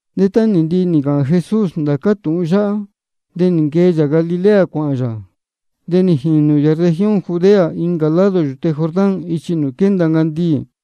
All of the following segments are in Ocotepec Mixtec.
De tá nī ndihi nī ncāhān Jesús ndācá tūhun yáhá, de nī nquee yā Galilea cuāhān yā. De nī jīnū yā región Judea, incā lado yūte Jordán ichi nūū quénda ncandiī.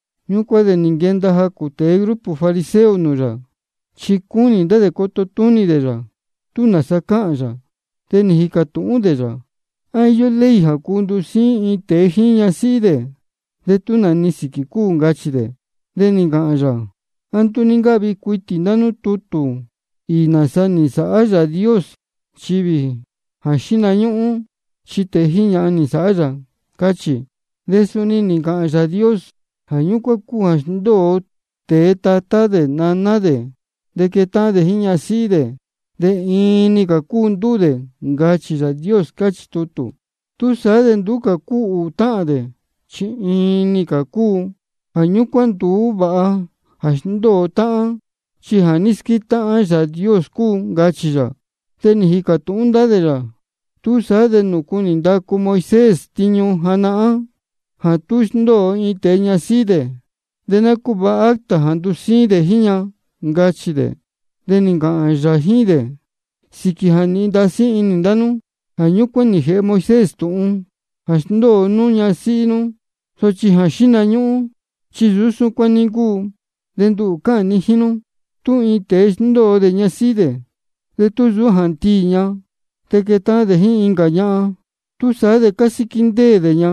Ñúcuán de nī nquenda jacū tēe grupo fariseo nūū yā, chi cúnī ndá dē coto túnī dē yā, tú nāsa cāhān yā. De nī jīcā tūhún dē yā: ¿A íyó ley jā cuu ndusíín iin tēe jíín ñasíhí dē tú nā-ni sīquī cúu? ncachī dē. De nī ncāhān yā: ¿A nduú ní ncáhvi cuitī ndá nú tutū īī nāsa nī nsāhá Yāā Dios nchivī jondē jā xíhna ñúhún? Chi tēe jíín ñahan nī nsāhá yā, cáchī. De suni nī ncāhān Yāā Dios: Jā ñúcuán cúu jā sndóo tēe tatá dē naná dē, de quétáhán dē jíín ñasíhí dē, de iin-ni cā cúu ndúū dē, ncachī Yāā Dios, cáchī tutū. Túsaá de nduú cā cúu ūū táhān dē, chi iin-ni cā cúu. Jā ñúcuán nduú vāha jā sndóo táhán, chi jā ní squétáhán Yāā Dios cúu, ncachī yā. De nī jīcā tūhún ndá dē yā: ¿Túsaá de nūcu nī ndacu Moisés tiñu janahán jā tú sndóo iin tēe ñasíhí dē, de ná cúvāha acta jā ndusíín dē jíín ña? ncachī dē. De nī ncāhān yā jíín dē: Sīquī jā nīhin inī ndá nú, jā ñúcuán nī jēhe Moisés tūhun jā sndóo nú ñasíhí nú. Sochi jā xíhna ñúhún chi nsūú súcuán ní ncúu. De nduhū chi cáhān ni jíín nú, tú iin tēe sndóo dē ñasíhí dē, de tú nsūú jā ndiī ña, de quetáhán dē jíín incā ñahan, túsaá de cásíquí ndéē dē ña.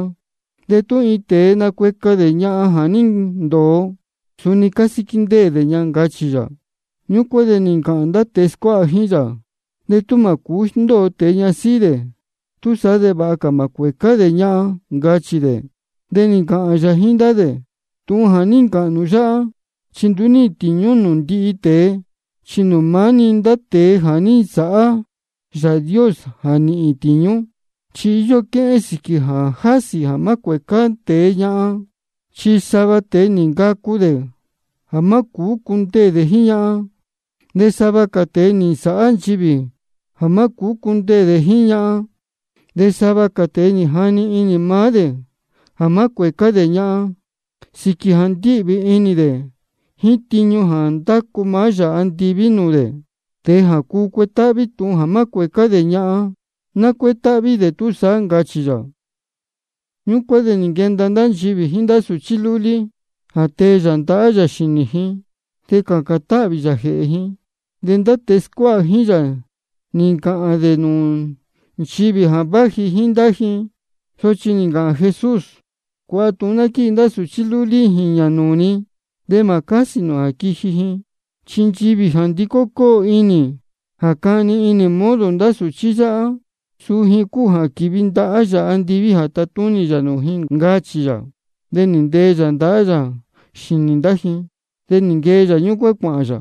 De tú iin tēe nacueca dē ñahan jā ní ndōo, suni cásíquí ndéē dē ña, ncachī yā. Ñúcuán de nī ncāhān ndá tēe scuáha jíín yā: De tú mā cūú sndóo tēe ñasíhí dē, túsaá de vāha cā mā cuēcá dē ñahan, ncachī dē. De nī ncāhān yā jíín ndá dē: Tūhun jā ní ncāhān nū yáhá, chi nduú níhīn tīñú nūū ndihi tēe, chi maá-ni nūū ndá tēe jā ní nsāhá Yāā Dios jā nīhīn tīñú. Chi íyó quéhén sīquī jā jásī jā má cuēcá tēe ñahan. Chi sava tēe nī ncacu dē jā má cūú cundeē dē jíín ñahan. De sava cā tēe nī nsāhá nchivī jā má cūú cundeē dē jíín ñahan. De sava cā tēe nī jani inī maá dē jā má cuēcá dē ñahan sīquī jā ndíhvī inī dē jíín tiñu jā ndácu Yāā andiví nūū dē. Tēe jā cuu cuetáhví tūhun jā má cuēcá dē ñahan, ná cuétáhví dē túsaá, ncachī yā. Ñúcuán de nī nquenda ndá nchivī jíín ndá sūchí lúlí, jā tee yā ndahá yā xīnī ji de cācān táhvī yā jēhē ji. De ndá tēe scuáha jíín yā nī ncāhān dē nūū nchivī jā váji jíín ndá ji. Sochi nī ncāhān Jesús: Cuāha tūhun ná quíji ndá sūchí lúlí jīñā nūū ni, de mā cásī nū jā quiji ji. Chi nchivī jā ndicó cóo inī jā cani inī ji modo ndá sūchí yáhá, suu ji cúu jā quīvi ndahá Yāā andiví jā tatúnī yā nūū ji, ncachī yā. De nī ntee yā ndahá yā xīnī ndá ji. De nī nquee yā ñúcuán cuāhān yā.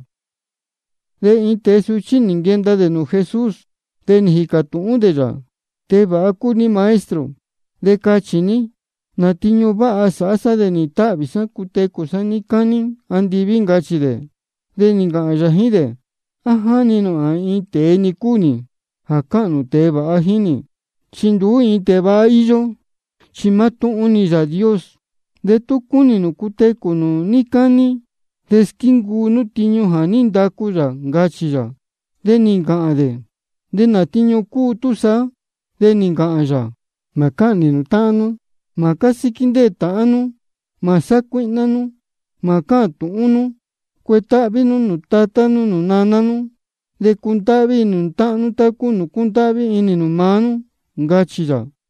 De iin tēe suchí nī nquenda dē nūū Jesús, de nī jīcā tūhún dē yā: Tēe vāha cúu ní Maestro. De cachī ní, ¿nā tiñu váha sāhá sá de nīhīn táhvī sá cutecū sá níí cání andiví? ncachī dē. De nī ncāhān yā jíín dē: ¿A jáni inī nū jā iin tēe-ni cúu nī jā cáhān nū tēe vāha jíín nī? Chi nduú ni iin tēe vāha íyó, chi mátúhún-ni Yāā Dios. De tú cúnī nū cutecū nū níí cání, de squíncuu nú tiñu jā ní ndacu yā, ncachī yā. De nī ncāhān dē: ¿De nā tiñu cúu túsaá? De nī ncāhān yā: Mā cáhnī nū ndīyi. Mā cásíquí ndéē tāhán nú. Mā sácuíhná nú. Mā cáhān nū tūhun túhún. Cuetáhví nú nūū tatá nú nūū naná nú. De cundáhví inī nū táhán nú tá cúu nūū cúndáhví inī nū maá nú, ncachī yā.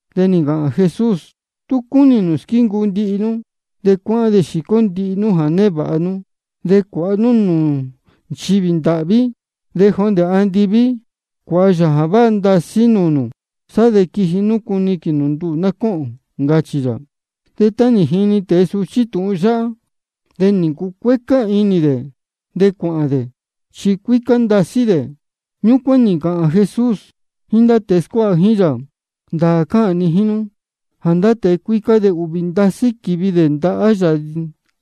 De nī ncāhān Jesús: Tú cúnī nū squíncuu ndihi nú, de cuáhán de xīcó nú ndihi jā névāha nú, de cuāha nú nūū nchivī ndāhví. De jondē andiví cuāha yā jā váha ndasí nūū nū. Sá de quiji nú cuniquīn nū nduhū cōhōn, ncachī yā. De tá nī jini tēe suchí tūhun yáhá, de nī ncucuécá inī dē de cuāhān dē, chi cuícá ndasí dē. Ñúcuán de nī ncāhān Jesús jíín ndá tēe scuáha jíín yā: Ndāā cáhān ni jíín nú jā ndá tēe cuícá chi ūhvī ndasí quívi dē ndahá Yāā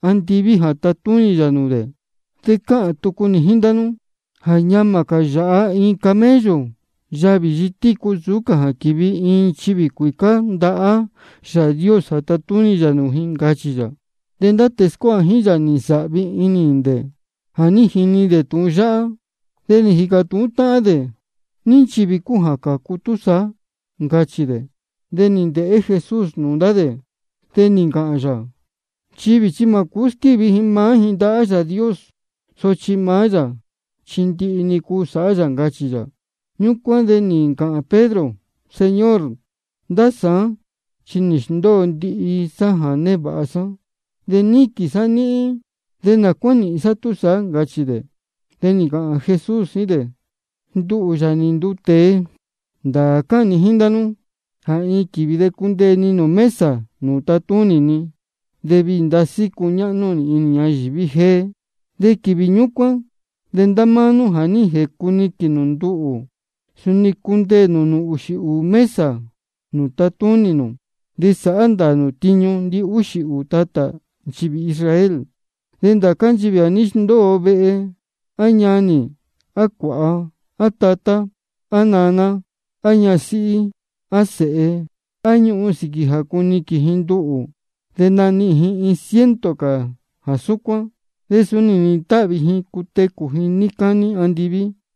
andiví jā tatúnī yā nūū dē. De cáhān tucu nī jíín ndá nú jā ñamā cā yāhá iin camello yavī yitícú nsūú cā jā quīvi iin nchivī cuīcá ndahá Yāā Dios jā tatúnī yā nūū ji, ncachī yā. De ndá tēe scuáha jíín yā nī nsāhvi ndasí inī dē jā ní jini dē tūhun yáhá, de nī jīcā tūhún táhán dē: ¿Ní nchivī cúu jā cācu túsaá? ncachī dē. De nī ndēhé Jesús nūū ndá dē, de nī ncāhān yā: Nchivī chi mā cūú squívi ji maá ji ndahá Yāā Dios, sochi maá yā chi ndihi-ni cuu sāhá yā, ncachī yā. Ñúcuán de nī ncāhān Pedro: Señor, ndá sāán chi nī sndóo sá ndihi jā névāha sá, de níquīn sá níhín. ¿De nā cuá nīhīn sá túsaá? ncachī dē. De nī ncāhān Jesús jíín dē: Nduhū, Yāā nī nduu tēe, ndāā cáhān ni jíín ndá nú jā iin quīvī de cundeē ni nūū mesa nūū tatúnī ni, de viī ndasí cuñáhnú nī inī ñayīví jéé. De quīvī ñúcuán de ndá máá nú jā ní jēcuniquīn nū nduhū, suni cundeē nū nūū ūxī ūū mesa nūū tatúnī nū. De sāhá ndāā nū tiñu ndihúxī ūū tatā nchivī Israel. De ndācá nchivī jā ní sndóo vehe, á ñanī, á cuāha, á tatá, á naná, á ñasíhí, á sēhe, á ñuhun, sīquī jā cuniquīn ji nduhū, de nanihīn ji iin ciento cā jā súcuán. De suni nīhīn táhvī ji cutecū ji níí cání andiví.